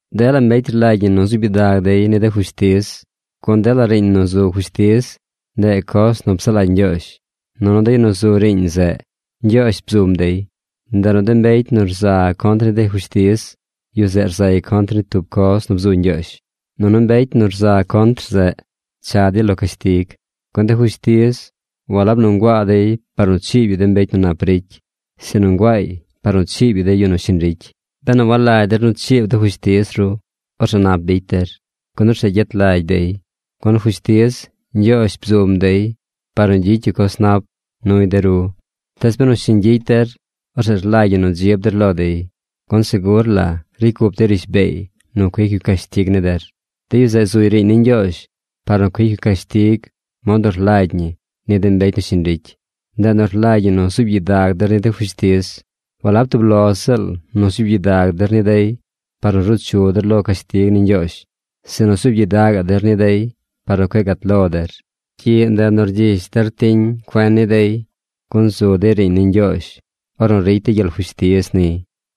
Dela mbecy rlagy ñi nu zuub gyidag dey ni de fushtiz. Gun dela riiñ nu zu fushtiz, ndeꞌ coz nu psaꞌ lagy Ñgyoozh, nunu de yu nu zu riiñ zeꞌ, Ñgyoozh bzum dey. Ndeꞌ nu de mbecy nu rza contr ni de fushtiz, yu zeꞌ rzay contr ni tub coz nu bzu Ñgyoozh, nunu mbecy nu rza contr zeꞌ, cha dey lo cashtig. Gun de fushtiz walab nu nguaa dey par nu chiib yu de mbecy nu nap ricy, sinu nguaay par nu chiib yu de yu nu shiñ ricy. Benu walagy der nu chiib de fushtiz ru, orzeꞌ nap bicy der. Gun orzeꞌ gyet lagy dey. Gun fushtiz, Ñgyoozh bzum dey par nu gyicy yu coz nap nuy de ru. Tees benu shiñ gyicy der, orzeꞌ rlagy ñi nu dzib der lo dey. Gun segur la ricy cup dey rishbeey nu cuic yu cashtig ni der. De yu zeꞌ zuy riiñ ni Ñgyoozh par nu cuic yu cashtig mod nu rlagy ñi ni de mbecy nu shiñ ricy. Ndeꞌ nu rlagy ñi nu zuub gyidag der ni de fushtiz. Walab tub lo ziꞌl nu zuub gyidag der ni dey par nu ruu chu der lo cashtig ni Ñgyoozh, sinu zuub gyidagaꞌ der ni dey par nu cueꞌ gat lo der. Gyiꞌ ndeꞌ nu rgyish der tiñ cuen ni dey, gun zu dey riiñ ni Ñgyoozh ornu ricy dey gyel fushtiz niy.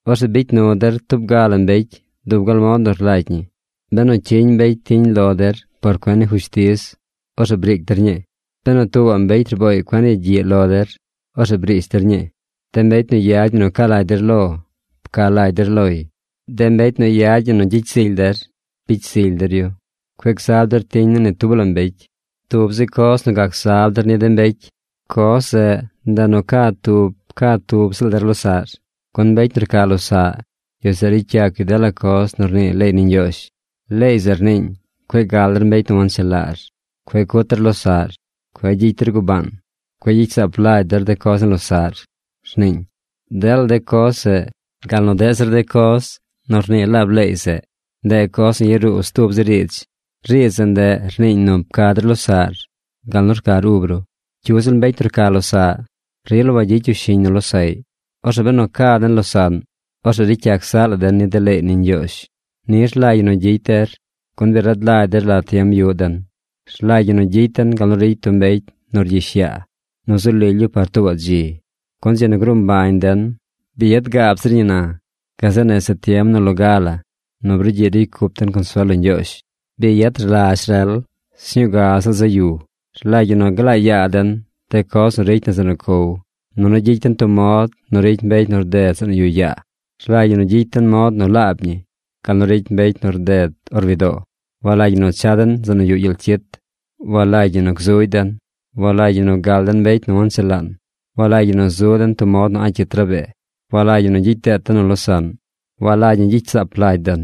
Orzeꞌ bicy nu der tub ga la mbecy dub gal mod nu rlagy ñi. Benu cyiñ mbecy tiñ lo der por cuen ni fushtiz, orzeꞌ briic der ñii. Benu tuubaꞌ mbecy rbooy cuen yagyiꞌ lo der, orzeꞌ briish der ñii. De mbecy nu yad ñi nu ca lagy der lo, pca lagy der loy. De mbecy nu yad ñi nu gyicy zily der, bicy zily der yu. Cueꞌ gzab der tiñ ni ni tub la mbecy. Tub zi coz gac zab der ni de mbecy: coz zeꞌ ndeꞌ nu ca tub ca tub ziꞌl der losaꞌr, gun mbecy nu rca losaꞌ, yu zeꞌ ricy yac yu dela coz nu rnii leey ni Ñgyoozh. Leey zeꞌ rniiñ: “Cueꞌ gal der mbecy nu wanchelaar. Cueꞌ cut der losaꞌr. Cueꞌ gyicy der gubaan. Cueꞌ gyicy saap lagy der de coz ni losaꞌr”, rniiñ. Dela de coz zeꞌ, gal nu deꞌ zir coz nu rnii laab leey zeꞌ, ndeꞌ coz nu yaruu stub zi riidz. Riidz zeꞌ ndeꞌ rniiñ nu pca der losaꞌr gal nu rcar ub ru. Cyu ziꞌl mbecy nu rca losaꞌ, rila wagyicy yu shiñ nu losaꞌy. Orzeꞌ benu ca den losaꞌn, orzeꞌ ricy yac zaꞌ la den ni de leey ni Ñgyoozh. Ni rlagy ñi nu gyicy der, gun bi rad lagy der la tiem yuꞌ den. Rlagy ñi nu gyicy den gal nu ricy tub mbecy nu rgyish yaa nu zu lily yu par tuubaꞌ dzi, gun dzi nu gruu mbañ den bi yad gaab zir ñi na gazeꞌ nese tiem nu loga la nu brugyiꞌ nu ricy cup den consuel lo Ñgyoozh. Bi yad rlazh rel. Sñuu ga ziꞌl zaꞌ yu. Rlagy ñi nu glaa yaa den de coz nu ricy na zeꞌ nu cow, nunu gyicy den tub mod nu ricy mbecy nu rded zeꞌ nu yuꞌ yaa. Rlagy ñi gyicy den mod nu laab ñi gal nu ricy mbecy nu rded or widoo. Walagy ñi nu cha den zeꞌ nu yuꞌ gyel cyit. Walagy ñi nu gzugy den. Walagy ñi nu gal den mbecy nu wanchelaan. Walagy ñi zu den tub mod nu a̱ꞌ cyit rabee. Walagy ñi gyicy deet den nu losaꞌn. Walagy ñi gyicy saap lagy den.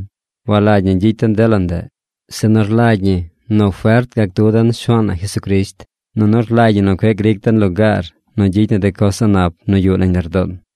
Walagy ñi gyicy den dela ndeꞌ, sinu rlagy ñi nu fert gac du den Shuaan na Jesucrisht. Nunu rlagy ñi nu cueꞌ gric den lugaar nu gyicy na de coz a̱ꞌ nap nu yuꞌ nañ lardoon.